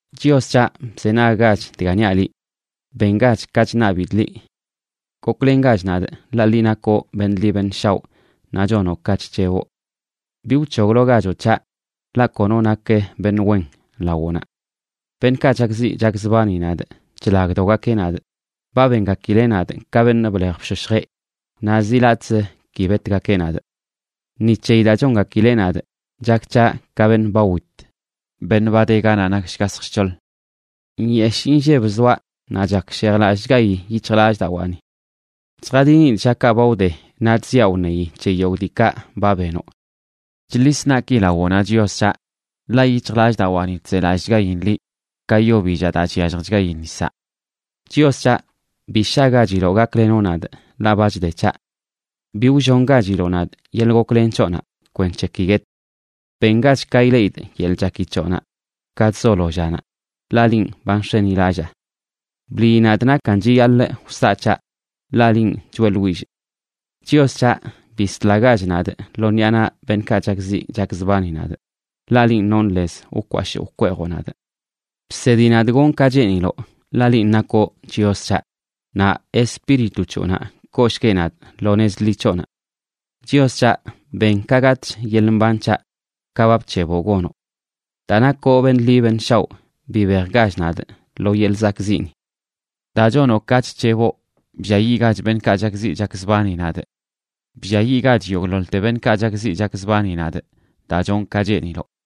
Chios c̱haꞌ, bzenaggach dga niaꞌ liꞌ; bengach ka chṉabidꞌ liꞌ. Goklengach nadꞌ, ḻaꞌ liꞌ nakoꞌ beṉꞌ ḻi beṉꞌ shaoꞌ naꞌ chonoꞌ ka chc̱heboꞌ. Bi wc̱hoglogachoꞌ c̱haꞌ, ḻaꞌ kono nak beṉꞌ wen lawoꞌnaꞌ. Beṉꞌkaꞌ chakziꞌ chakzbani nadꞌ chlagdogakeꞌ nadꞌ; ba bengakileꞌ nadꞌ ka beṉꞌ blej bshoshjeꞌ naꞌ zi latꞌz ki betgakeꞌ nadꞌ. Ni c̱heyi daa chongakileꞌ nadꞌ chak c̱haꞌ ka beṉꞌ ba wit, beṉꞌ ba de ganaꞌ nak shgashj shc̱hoḻ. Nyeshꞌ inlleb zoaꞌ, naꞌ chakshejlallꞌchgayi yic̱hjlallꞌdawaani. Chjadinidꞌ llakaꞌ ba wde, naꞌ chziaꞌ wṉeyi c̱he yogꞌ diikaꞌ ba benoꞌ. Chḻis naꞌki lawoꞌnaꞌ, Chios c̱haꞌ, ḻaꞌ yic̱hjlallꞌdawaani chzelallꞌchgain liꞌ, ka yo billaꞌ daa chyalljchgayi nisaꞌ. Chios c̱haꞌ, ¡bi shagachiloꞌ gaklenoꞌ nadꞌ, ḻaꞌ ba chde c̱haꞌ! Bi wllongachiloꞌ nadꞌ yeḻꞌ goklen c̱hoꞌnaꞌ, kwenc̱he ki guetꞌ. Bengach ka ileꞌidꞌ yeḻꞌ chaki c̱hoꞌnaꞌ ka chzolo llanaꞌ, ḻaꞌ linꞌ ba nx̱enilallaa. Bliyi nadꞌ nakan chiyaḻꞌ wsaꞌ c̱haꞌ, ḻaꞌ linꞌ choeꞌḻwillꞌ. Chios c̱haꞌ, bislagach nadꞌ lo ṉiꞌa naꞌ beṉꞌkaꞌ chakziꞌ chakzbani nadꞌ, ḻaꞌ linꞌ nonꞌ lez wkwashꞌ wkweejoꞌ nadꞌ. Bsedi nadꞌ gonꞌ ka cheeniloꞌ, ḻaꞌ linꞌ nakoꞌ Chios c̱haꞌ. Naꞌ Espíritu c̱hoꞌnaꞌ kooshgueꞌ nadꞌ lo nez ḻi c̱hoꞌnaꞌ. Chios c̱haꞌ, ben ka gatꞌch yeḻꞌ mbanꞌ c̱haꞌ, ka ba bc̱heboꞌ gonoꞌ. Daa nakoꞌ beṉꞌ ḻi beṉꞌ shaoꞌ bibejgach nadꞌ lo yeḻꞌ zakꞌziꞌni. Daa chonoꞌ ka chc̱heboꞌ, blliayiꞌgach beṉꞌkaꞌ chakziꞌ chakzbani nadꞌ. Blliayiꞌgach yogꞌḻoḻte beṉꞌkaꞌ chakziꞌ chakzbani nadꞌ, daa chonꞌ ka cheeniloꞌ.